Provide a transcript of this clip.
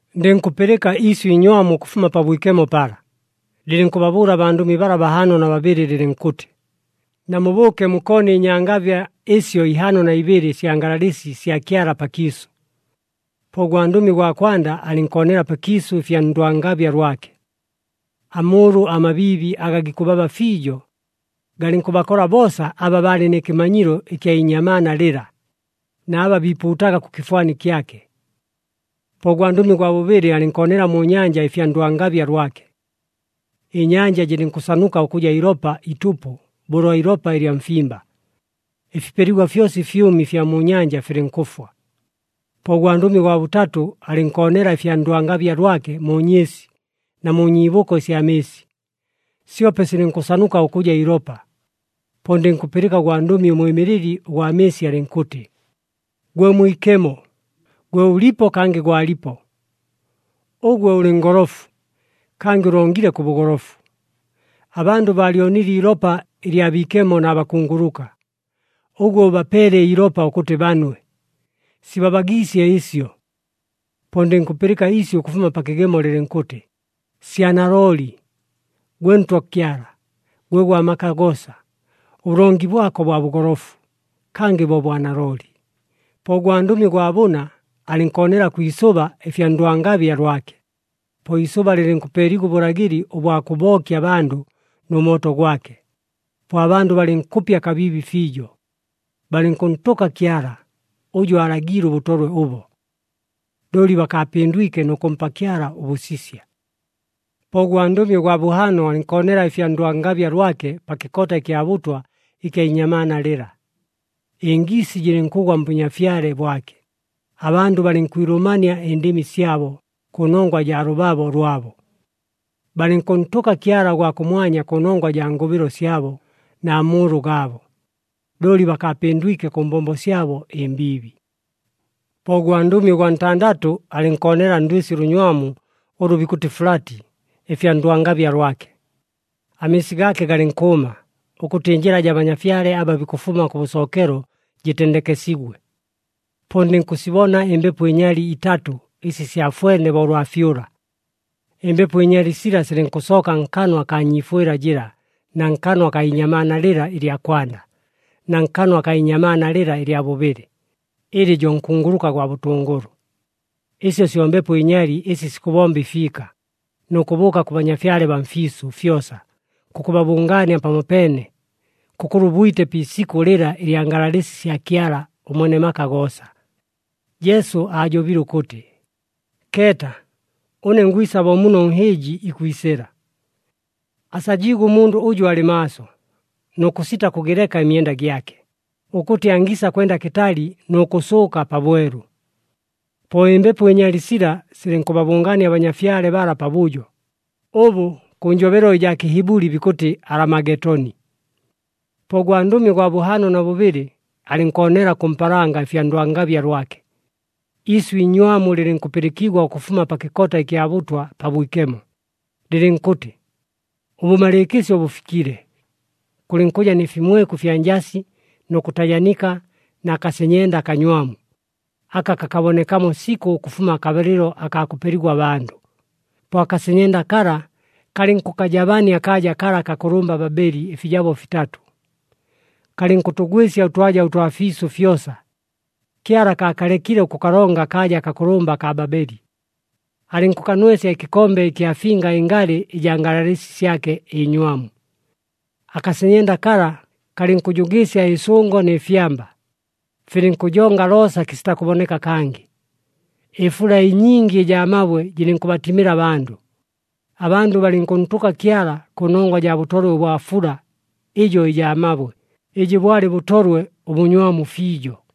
Ndɨnkʉpɨlɨka iisyʉ iinywamu ʉkʉfuma Pabwikemo pala, lɨlɨnkʉbabʉʉla abandʉmi bala bahaano na babɨlɨ, lɨlɨnkʉtɨ, “Namubʉʉke mukoone ɨnyangabya ɨsyo ihaano na ibɨlɨ ɨsya ngalalɨsi sya Kyala pakiisʉ.” Po ʉgwandʉmi ʉgwa kwanda alɨnkoonela pakiisʉ ɨfya ndwangabya lwake. Amʉʉlʉ amabiibi aga gikʉbaba fiijo, galɨnkʉbakola boosa aba baalɨ nɨ kɨmanyilo ɨkya inyamaana lɨla, na aba biipuutaga kʉ kɨfwani kyake. Po ʉgwandʉmi ʉgwa bʉbɨlɨ alɨnkoonela mu nyanja ɨfya ndwangabya lwake. Ɨnyanja jɨlɨnkʉsanuka ʉkʉja ilopa itʉpʉ bo ʉlwa ilopa ɨlya mfimba. Ɨfipeligwa fyosa ɨfyʉmi ɨfya mu nyanja filɨnkʉfwa. Po ʉgwandʉmi ʉgwa bʉtatʉ alɨnkoonela ɨfya ndwangabya lwake mu nyɨɨsi na mu nyiibʉko ɨsya mɨɨsi, syope silɨnkʉsanuka ʉkʉja ilopa. Po ndɨnkʉpɨlɨka ʉgwandʉmi ʉmwɨmɨlɨli ʉgwa mɨɨsi alɨnkʉtɨ, “Gwe Mwikemo, gwe ʉlipo, kangɨ gwalipo! Ʉgwe ʉlɨ ngolofu, kangɨ ʉlongile kʉ bʉgolofu. Abandʉ baalyonile iilopa ɨlya biikemo na bakunguluka. Ʉgwe ʉbapeele iilopa ʉkʉtɨ banwe. Sibabagiisye ɨsyo!” Po ndɨnkʉpɨlɨka iisyʉ ʉkʉfuma pa kɨgemo lɨlɨnkʉtɨ, “Sya nalooli! Gwe Ntwa Kyala, gwe Gwa maka goosa! Ʉbʉlongi bwako bwa bʉgolofu, kangɨ bo bwa nalooli!” Po ʉgwandʉmi ʉgwa bʉna alɨnkoonela kwi isʉba ɨfya ndwangabya lwake. Po iisʉba lɨlɨnkʉpeeligwa ʉbʉlagɨli ʉbwa kʉbookya abandʉ nʉ mooto gwake. Po abandʉ balɨnkʉpya kabiibi fiijo. Balɨnkʉntʉka Kyala, ʉjʉ aalagiile ʉbʉtolwe ʉbo. Looli bakaapɨndwike nʉ kʉmpa Kyala ʉbʉsisya. Po ʉgwandʉmi ʉgwa bʉhaano alɨnkoonela ɨfya ndwangabya lwake pa kɨkota ɨkya bʉtwa ɨkya inyamaana lɨla. Ɨngiisi jɨlɨnkʉgwa mbʉnyafyale bwake, abandʉ balɨnkwilʉmania ɨndɨmi syabo kʉnongwa jaa lʉbabo lwabo. Balɨnkʉntʉka Kyala ʉgwa kʉmwanya kʉnongwa jaa ngʉbɨlo syabo na mʉʉlʉ gaabo. Looli bakaapɨndwike kʉ mbombo syabo ɨmbiibi. Po ʉgwandʉmi ʉgwa ntandatʉ alɨnkoonela ndwɨsi ʉlʉnywamu ʉlʉ bikʉtɨ Fulati ɨfya ndwangabya lwake. Amɨɨsi gaake galɨnkʉʉma, ʉkʉtɨ ɨnjɨla jaa banyafyale aba bikʉfuma kʉbʉsookelo jɨtendekesigwe. Po ndɨnkʉsibona ɨmbepo ɨnyali itatʉ ɨsi syafwene bo ʉlwa fyʉla. Ɨmbepo ɨnyali sila silɨnkʉsooka nkanwa akaa nyiifwɨla jɨla na nkanwa akaa inyamaana lɨla ɨlya kwanda, na nkanwa akaa inyamaana lɨla ɨlya bʉbɨlɨ, ɨlɨ jo nkunguluka gwa bʉtʉngʉlʉ. Ɨsyo syo mbepo ɨnyali ɨsi sikʉbomba ɨfiika, nʉ kʉbʉʉka kʉ banyafyale baa mfiisʉ fyosa, kʉkʉbabʉngaania pamopeene, kʉkʉlwa ʉbwite pi isikʉ lɨla ɨlya ngalalɨsi sya Kyala ʉMwene maka goosa. Jesu aajobile ʉkʉtɨ, “Keeta! Ʉne ngwisa bo muno ʉnhɨɨji ikwisɨla! Asajiigwe ʉmundʉ ʉjʉ alɨ maaso nʉ kʉsita kʉgɨleka ɨmyenda gyake, ʉkʉtɨ angiisa kwenda kɨtali nʉ kʉsʉʉka pabwelu.” Po ɨmbepo ɨnyali sila silɨnkʉbabʉngaania abanyafyale bala pabʉjo, ʉbʉ kʉ njobelo ɨjaa Kɨhibʉli bikʉtɨ Alamagetoni. Po ʉgwandʉmi ʉgwa bʉhaano na bʉbɨlɨ, alɨnkoonela kʉ mpaalanga ɨfya ndwangabya lwake. Iisyʉ iinywamu lɨlɨnkʉpɨlɨkigwa ʉkʉfuma pa kɨkota ɨkya bʉtwa pabwikemo, lɨlɨnkʉtɨ, “Ʉbʉmalɨɨkɨsyo bʉfikile!” Kʉlɨnkʉja nɨ fimweku ɨfya njasi nʉ kʉtajanika na kasenyenda akanywamu aka kakabonekamo sikʉ ʉkʉfuma akabalɨlo akaa kʉpeligwa abandʉ. Po akasenyenda kala, kalɨnkʉkajabania akaaja kala akakʉlʉmba Babeli ɨfijabo fitatʉ. Kalɨnkʉtʉgwɨsya ʉtwaja ʉtwa fiisʉ fyosa. Kyala akaakalekile ʉkʉkalonga akaaja akakʉlʉmba akaa Babeli. Alɨnkʉkanwesya ɨkɨkombe ɨkya finga ɨngalɨ ɨjaa ngalalɨsi syake ɨnywamu. Akasenyenda kala kalɨnkʉjʉgɨɨsya ɨsʉngo nɨ fyamba. Filɨnkʉjonga loosa kɨsita kʉboneka kangɨ. Ɨfula ɨnyingi ɨjaa mabwe jɨlɨnkʉbatimɨla abandʉ. Abandʉ balɨnkʉntʉka Kyala kʉnongwa jaa bʉtolwe ʉbwa fula ɨjo ɨjaa mabwe, ɨjɨ bwalɨ bʉtolwe ʉbʉnywamu fiijo.